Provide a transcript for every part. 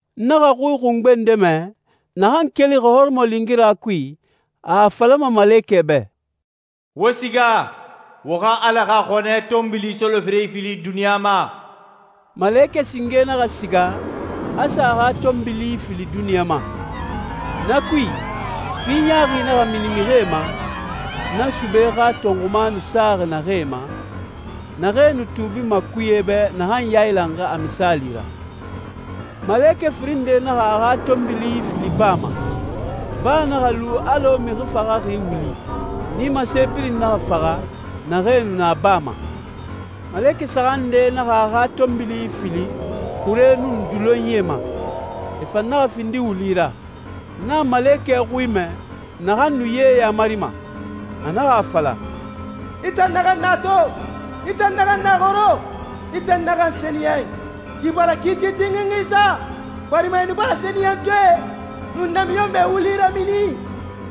N naxa xui xungbe nde mɛ, naxan kelixi hɔrɔmɔlingira kui, a a falama malekɛe bɛ, «Wo siga, wo xa Ala xa xɔnɛ tɔnbili soloferee ifili duniɲa ma.» Malekɛ singe naxa siga, a sa a xa tɔnbili ifili duniɲa ma. Na kui, fi ɲaaxi naxa mini mixie ma, na sube xa tɔnxuma nu saxi naxee ma, naxee nu tuubima kuye bɛ naxan yailanxi a misaali ra. Malekɛ firin nde naxa a xa tɔnbili ifili baa ma. Baa naxa lu alɔ mixi faxaxi wuli. Nimase birin naxa faxa, naxee nu na baa ma. Malekɛ saxan nde naxa a xa tɔnbili ifili xuree nun dulonyie ma. E fan naxa findi wuli ra. N naxa malekɛ xui mɛ, naxan nu ye yamarima. A naxa a fala, «I tan naxan na to, i tan naxan na xoro, i tan naxan sɛniyɛn, i bara kiiti tinxinxi sa, barima e nu bara sɛniyɛntɔɛe nun namiɲɔnmɛe wuli ramini.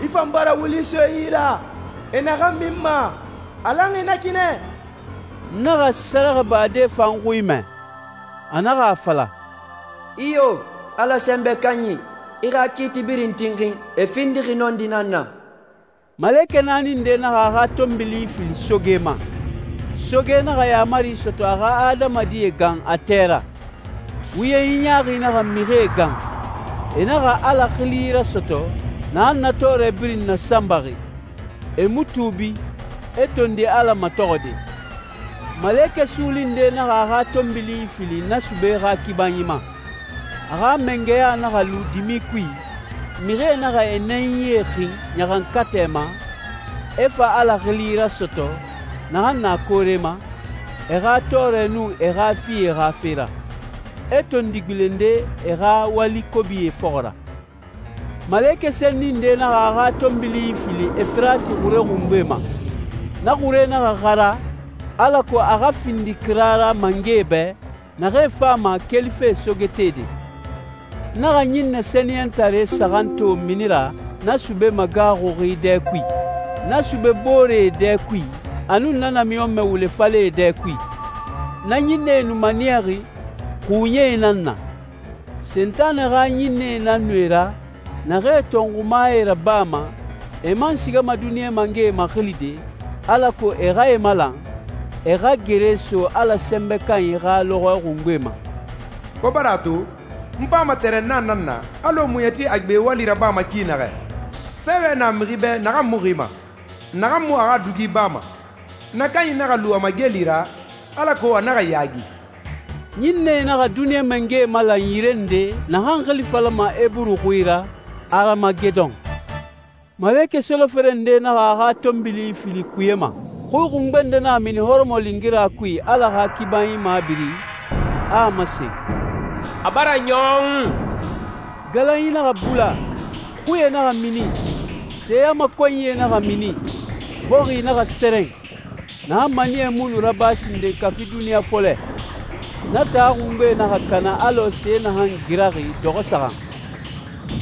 I fan bara wuli so e yi ra, e naxan minma. A lanxi na ki nɛ.» N naxa sɛrɛxɛbade fan xui mɛ. A naxa a fala, «Iyo, Ala Sɛnbɛ Kanyi, i xa kiiti birin tinxin, e findixi nɔndi nan na.» Malekɛ naani nde naxa a xa tɔnbili ifili soge ma. Soge naxa yaamari sɔtɔ a xa adamadie gan a tɛ ra. Wuyenyi ɲaaxi naxa mixie gan. E naxa Ala xili rasɔtɔ, naxan na tɔɔrɛ birin nasanbaxi. E mu tuubi, e tondi Ala matɔxɔde. Malekɛ suuli nde naxa a xa tɔnbili ifili na sube xa kibanyi ma. A xa mangɛya naxa lu dimi kui, mixie naxa e nɛnyie xin ɲaxankatɛ ma, e fa Ala xili rasɔtɔ, naxan na koore ma, e xa tɔɔrɛ nun e xa fie xa fe ra. E tondi gbilende e xa wali kobie fɔxɔ ra. Malekɛ senni nde naxa a xa tɔnbili ifili Efirati xure xungbe ma. Na xure naxa xara, alako a xa findi kira ra mangɛe bɛ, naxee fama kelife sogetede. N naxa ɲinnɛ sɛniyɛntare saxan to mini ra na sube magaaxuxi dɛ kui, na sube boore dɛ kui, a nun na namiɲɔnmɛ wule falɛ dɛ kui. Na ɲinnɛe nu maniyaxi xuuɲɛe nan na. Sentanɛ xa ɲinnɛe nan nu e ra, naxee tɔnxumae rabama, e man sigama duniɲa mangɛe maxilide, alako e xa e malan, e xa gere so Ala Sɛnbɛ Kanyi xa lɔxɔɛ xungbe ma. «Wo bara a to, n fama tɛrɛnna nan na, alɔ muɲɛti a gbe wali rabama ki naxɛ. Sɛɛwɛ na mixi bɛ naxan mu xima, naxan mu a xa dugi bama. Na kanyi naxa lu a mageli ra, alako a naxa yaagi.» Ɲinnɛe naxa duniɲa mangɛe malan yire nde naxan xili falama Eburu xui ra «Aramagedon.» Malekɛ solofere nde naxa a xa tɔnbili ifili kuye ma. Xui xungbe nde naxa mini hɔrɔmɔlingira kui Ala xa kibanyi mabiri, a a masen, «A bara ɲɔn.» Galanyi naxa bula, xuie naxa mini, seyamakɔnyie naxa mini, bɔxi naxa sɛrɛn, naxan maniyɛ mu nu raba sinden kafi duniɲa fɔlɛ. Na taa xungbe naxa kana alɔ se naxan giraxi dɔxɔ saxan.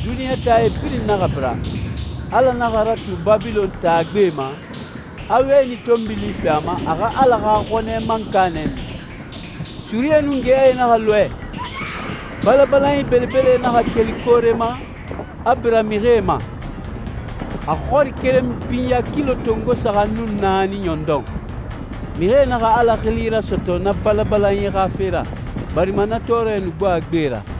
Duniɲa taae birin naxa bira. Ala naxa ratu Babilɔn taa gbe ma, a wɛni tɔnbili fi a ma a xa Ala xa xɔnɛ mankanɛ min. Surie nun geyae naxa lɔɛ. Balabalanyi belebelee naxa keli koore ma, e bira mixie ma. A xɔri keren binya kilo tongo saxan nun naani ɲɔndɔn. Mixie naxa Ala xili rasɔtɔ na balabalanyi xa fe ra, barima na tɔɔrɛ nu gbo a gbe ra.